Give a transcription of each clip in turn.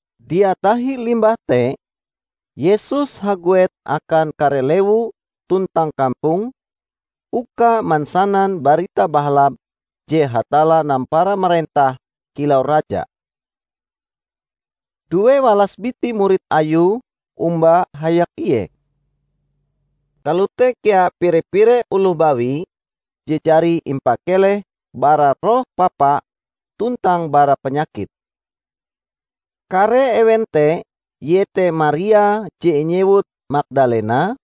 Dia tahi limbah te, Yesus haguet akan kare lewu tuntang kampong, uka mansanan Barita Bahalap je Hatalla nampara marentah kilau Raja. Duewalas biti murid Ayue omba hayak Ie. Kalote kea pire-pire oloh bawi je jari impakeleh bara roh papa tuntang bara panyakit. Kare ewen te iete Maria je inyewut Magdalena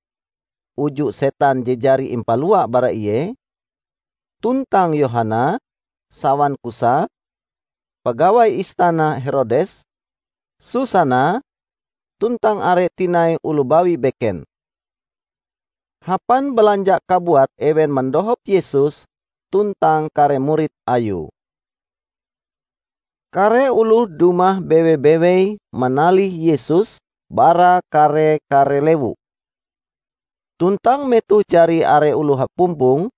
(uju setan je jari impalua bara ie); tuntang Yohana, sawan Kusa, pagawai istana Herodes; Susana, tuntang are tinai oloh bawi beken. Hapan balanja kabuat ewen mandohop Yesus tuntang kare murid Ayue. Kare oloh dumah bewe-bewei manalih Yesus bara kare-kare lewu. Tuntang metoh jari are oloh hapumpong,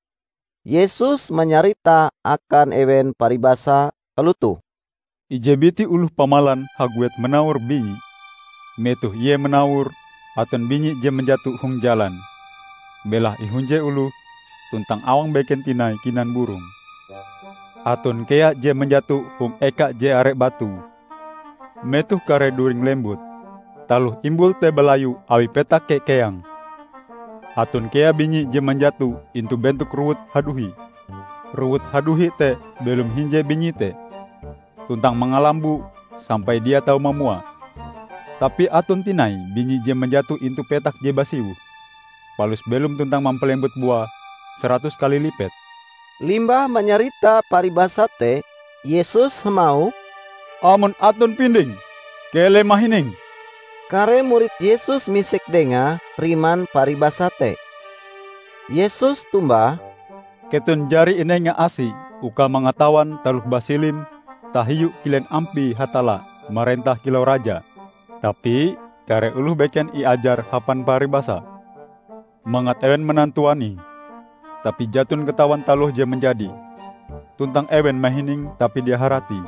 Yesus manyarita akan ewen paribasa kalotoh: "Ije biti oloh pamalan haguet manawor binyi. Metoh ie manawor, aton binyi je manjato hong jalan. Belahe ihunje oloh tuntang awang beken tinai kinan burong. Aton kea je manjato hong eka je are batu. Metoh kare duringe lembut, taloh imbul te balayu awi petake keang. Aton kea binyi je manjato intu bentok rowut haduhi. Rowut haduhi te belom hinje binyi te, tuntang mangalamboe sampai dia tau mamua. Tapi aton tinai binyi je manjato intu petak je basiwoh, palus belom tuntang mampalembut bua saratus kali lipet." Limbah manyarita paribasa te, Yesus hamauh, "Amon aton pinding, keleh mahining!" Kare murid Yesus misek Dengae riman paribasa te. Yesus tombah, "Keton jari inenga asi uka mangatawan taloh basilim tahiu kilen ampie Hatalla marentah kilau Raja. Tapi kare oloh beken iajar hapan paribasa, mangat ewen manantuanie, tapi jaton katawan taloh je manjadi; tuntang ewen mahining, tapi dia haratie."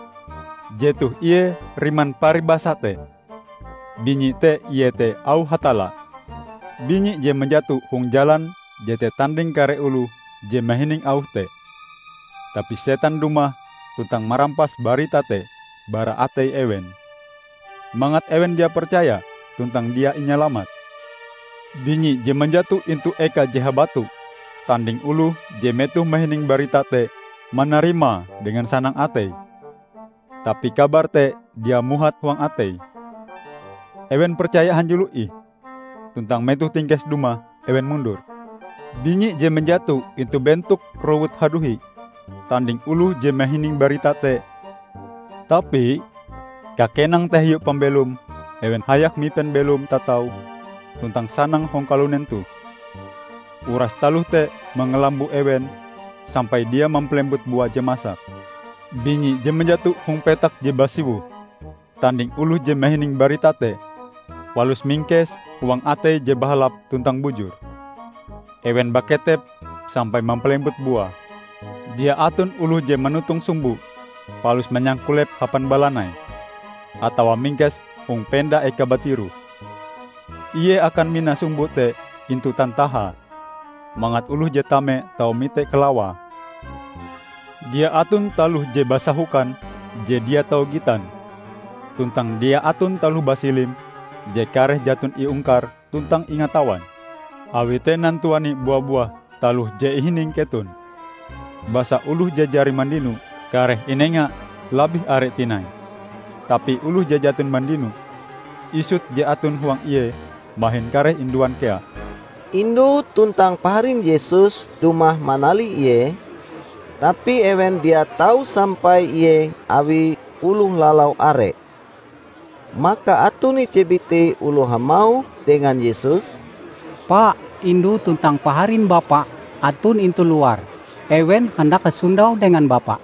"Jetoh ie riman paribasa te: Binyi te iete auh Hatalla. Binyi je manjato hong jalan jete tanding kare oloh je mahining auh te. Tapi setan dumah tuntang marampas barita te bara atei ewen, mangat ewen dia percaya tuntang dia inyalamat. Binyi je manjato intu eka je habatu, tanding oloh je metoh mahining barita te, manarimae dengan sanang ateie. Tapi kabar te dia muhat huang ateie. Ewen percaya hanjulo ih, tuntang metoh tingkes dumah, ewen mundur. Binyi je manjato intu bentok rowut haduhi tanding oloh je mahining barita te, tapi kakenang tahiu pambelom ewen hayak mipen belom tatau tuntang sanang hong kalunen toh. Uras taloh te mangalambo ewen sampai dia mampalembut bua je masak. Binyi je manjato hong petak je basiwoh tanding oloh je mahining barita te, palus mingkese huang ateie je bahalap tuntang bujur. Ewen baketep sampai mampalembut bua." "Dia aton oloh je manotong sumbo palus manyangkulepe hapan balanai, atawa mingkese hong penda eka batiroh. Ie akan mina sumbo te intu tantahae, mangat oloh je tame tau mite kalawae. Dia aton taloh je basahokan je dia tau gitan; tuntang dia aton taloh basilim je kareh jaton iungkar tuntang ingatawan. Awi te nantuani bua-buah taloh je ihining keton. Basa oloh je jari mandino, kareh inenga labih are tinai; tapi oloh je jaton mandino, isut je aton huang ie mahin kareh induan kea." Indu tuntang paharin Yesus dumah manalih Ie, tapi ewen dia tau sampai Ie awi oloh lalau are. Maka aton ije biti oloh hamauh dengan Yesus, "Pa, indu tuntang paharin Bapa aton intu luar. Ewen handak hasondau dengan Bapa."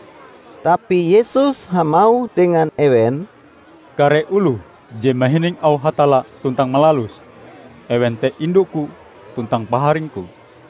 Tapi Yesus hamauh dengan ewen, "Kare oloh je mahining auh Hatalla tuntang malaluse, ewen te indu-Ku tuntang paharing-Ku."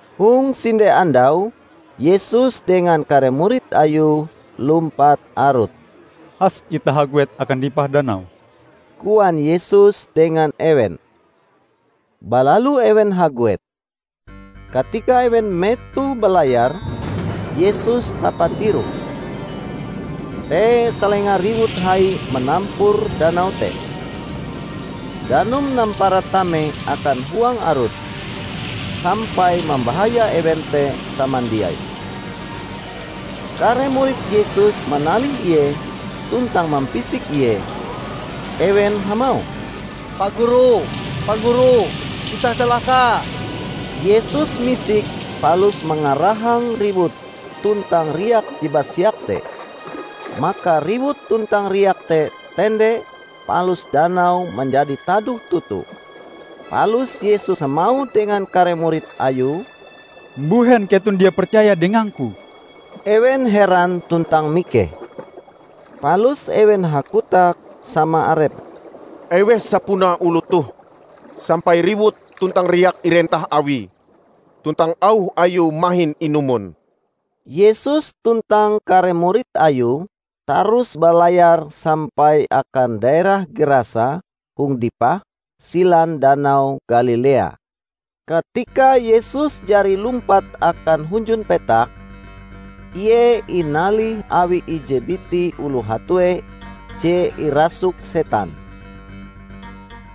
Hong sinde andau Yesus dengan kare murid Ayue lumpat arut. "Has itah haguet akan dipah danau," koan Yesus dengan ewen. Balalu ewen haguet. Katika ewen metoh balayar, Yesus tapatiroh. Te salenga riwut hai manampur danau te. Danum nampara tame akan huang arut, sampai mambahaya ewen te samandiai. Kare murid Yesus manalih Ie tuntang mampisik Ie. Ewen hamauh, "Pa Guru, Pa Guru, itah calaka!" Yesus misik palus mangarahang riwut tuntang riak je basiak te. Maka riwut tuntang riak te tende palus danau manjadi tadoh toto. Palus Yesus hamauh dengan kare murid Ayue, "Mbuhen keton dia percaya dengang-Ku?" Ewen heran tuntang mikeh. Palus ewen hakotak sama arepe, "Eweh sapunae oloh toh sampai riwut tuntang riak irentah Awie, tuntang auh Ayue mahin inumon!" Yesus tuntang kare murid Ayue tarus balayar sampai akan daerah Gerasa hong dipah silan Danau Galilea. Katika Yesus jari lumpat akan hunjun petak, Ie inalih awi ije biti oloh hatue je irasuk setan.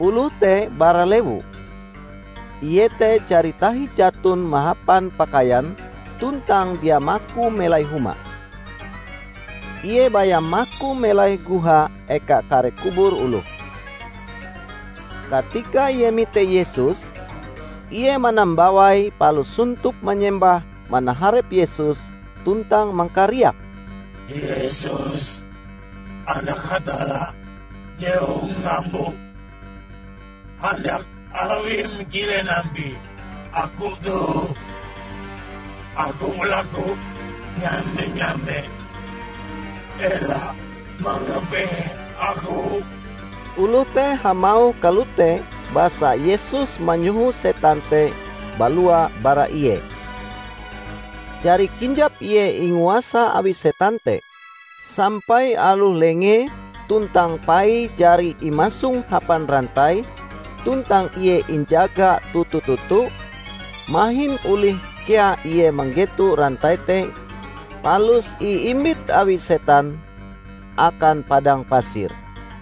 Oloh te bara lewu. Ie te jari tahi jaton mahapan pakaian tuntang dia maku melai huma. Ie baya maku melai goha eka kare kubur oloh. Katika ie mite Yesus, ie manambawai palus sontop manyembah manaharep Yesus tuntang mangkariak, "Yesus, Anak Hatalla Je Hong Ngambo! Handak Awim kilen ampie aku toh? Aku balaku nyame-nyame ela mangapehe aku!" Oloh te hamauh kalote basa Yesus manyoho setan te balua bara ie. Jari kinjap ie inguasa awi setan te, sampai aloh lengee tuntang paie jari imasong hapan rantai tuntang ie injaga toto-toto, mahin olih kea ie manggeto rantai te palus iimbit awi setan akan padang pasir.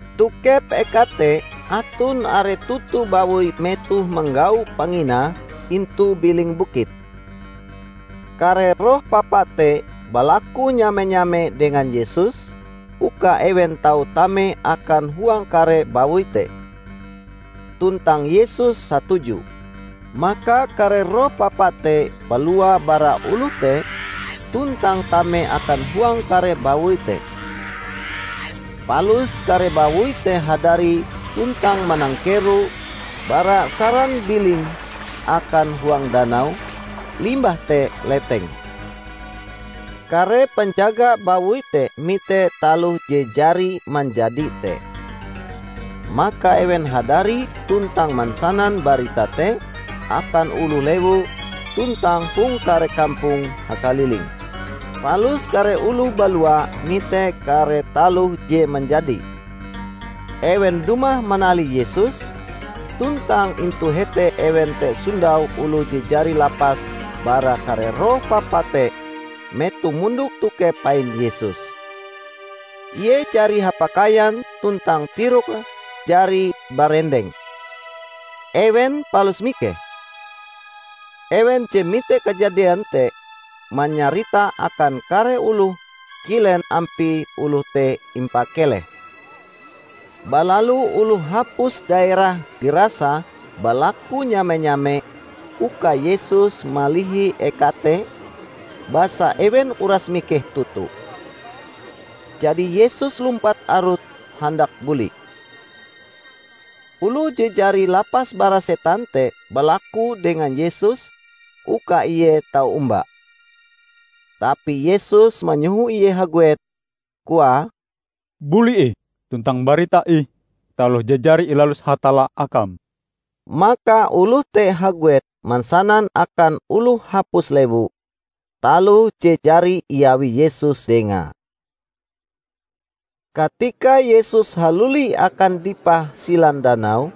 Tokep eka te aton are toto bawoi metohe manggau panginae intu biling bukit. Kare roh papa te balaku nyame-nyame dengan Yesus uka ewen tau tame akan huang kare bawoi te. Tuntang Yesus satuju. Maka kare roh papa te balua bara oloh te tuntang tame akan huang kare bawoi te. Palus kare bawoi te hadari tuntang manangkero bara saran biling akan huang danau, limbah te leteng. Kare panjaga bawoi te mite taloh je jari manjadi te. Maka ewen hadari tuntang mansanan barita te akan oloh lewu tuntang hong kare kampong hakaliling. Palus kare oloh balua mite kare taloh je manjadi. Ewen dumah manalih Yesus, tuntang intu hete ewen te sondau oloh je jari lapas bara kare roh papa te metohe mondok tokep pain Yesus. Ie jari hapakaian tuntang tiroke jari barendeng. Ewen palus mikeh. Ewen je mite kajadian te manyarita akan kare oloh kilen ampie oloh te impakeleh. Balalu oloh hapus daerah Gerasa balaku nyame-nyame uka Yesus malihi eka te, basa ewen uras mikeh toto. Jadi Yesus lumpat arut handak buli. Oloh je jari lapas bara setan te balaku dengan Yesus uka ie tau omba. Tapi Yesus manyoho ie haguet, koae, "Buli ih tuntang mbarita ih taloh je jari ilalus Hatalla akam." Maka oloh te haguet mansanan akan oloh hapus lewu, taloh je jari iawi Yesus dengae. Katika Yesus haluli akan dipah silan danau,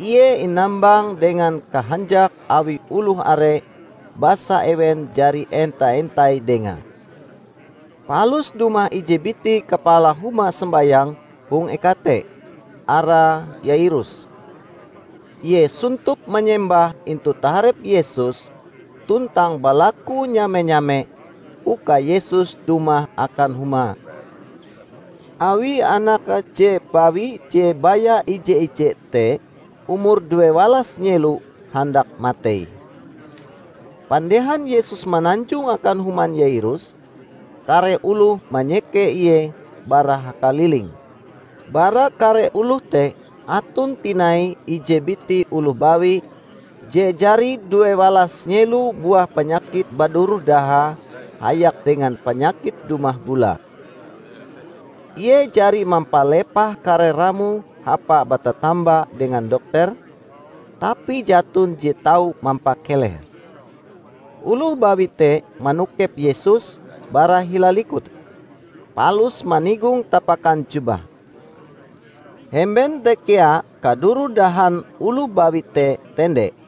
Ie inambang dengan kahanjak awi oloh are basa ewen jari enta-entai Dengae. Palus dumah ije biti kapala huma sombayang hong eka te. arae Yairus. Ie sontop manyembah intu taharep Yesus tuntang balaku nyame-nyame uka Yesus dumah akan humae, awi anake je bawi je baya ije-ije te umure duewalas nyelo handak matei. Pandehan Yesus mananjong akan human Yairus, kare oloh manyeke Ie bara hakaliling. Bara kare oloh te aton tinai ije biti oloh bawi je jari duewalas nyelo buah panyakit baduroh dahae hayak dengan panyakit dumah bulae. Ie jari mampalepah kare ramoe hapae batatamba dengan dokter, tapi jaton je tau mampakelehe. Oloh bawi te manokep Yesus bara hila likute, palus manigong tapakan jubahe. Hemben te kea kaduroh dahan oloh bawi te tende.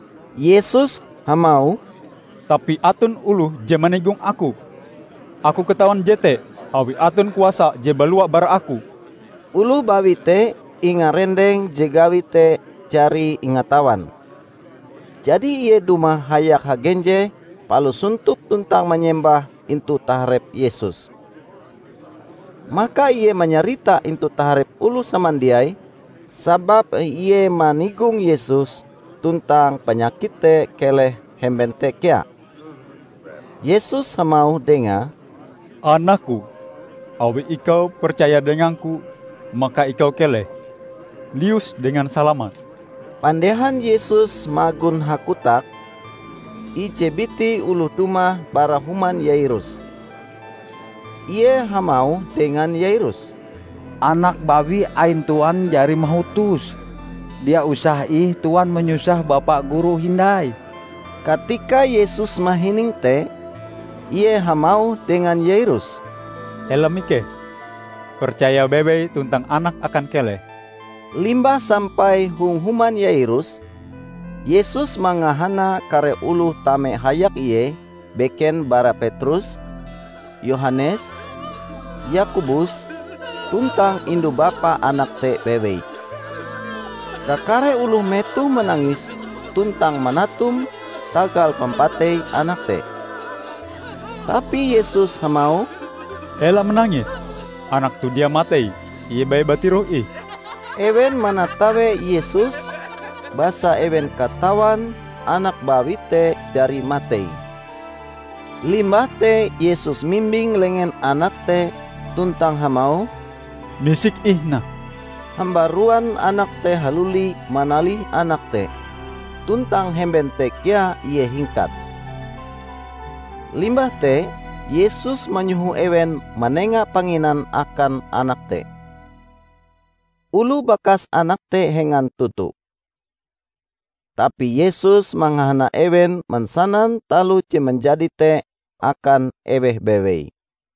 Yesus hamauh, "Tapi aton oloh je manigong Aku. Aku katawan jete awi aton kuasa je balua bara Aku." Oloh bawi te ingarendeng je gawie te jari ingatawan. Jadi ie dumah hayak hagenjeh palus sontop tuntang manyembah intu taharep Yesus. Maka ie manyarita intu taharep oloh samandiai sababe ie manigong Yesus, tuntang panyakite te keleh hemben te kea. Yesus hamauh dengae, "Anak-Ku, awi ikau percaya dengang-Ku, maka ikau keleh. Lius dengan salamat." Pandehan Yesus magon hakotak, ije biti oloh dumah bara human Yairus. Ie hamauh dengan Yairus, "Anak bawi ain Tuan jari mahutos. Dia usah ih Tuan manyusah Bapa Guru hindai." Katika Yesus mahining te, ie hamauh dengan Yairus, "Ela mikeh. Percaya bewei tuntang anakm akan keleh." Limbah sampai hong human Yairus, Yesus mangahana kare oloh tame hayak Ie beken bara Petrus, Yohanes, Yakobus tuntang indu bapa anak te bewei. Kakare oloh metohe manangis tuntang manatum tagal pampatei anak te. Tapi Yesus hamauh, "Ela manangis. Anak toh dia matei, ie baya batiroh ih!" Ewen manatawe Yesus, basa ewen katawan anak bawi te jari matei. Limbah te Yesus mimbing lengen anak te tuntang hamauh, "Misik ih, nak!" Hambaruan anak te haluli manalih anak te, tuntang hemben te kea ie hingkat. Limbah te Yesus manyoho ewen manenga panginan akan anak te. Oloh bakas anak te hengan toto. Tapi Yesus mangahana ewen mansanan taloh je manjadi te akan eweh bewei.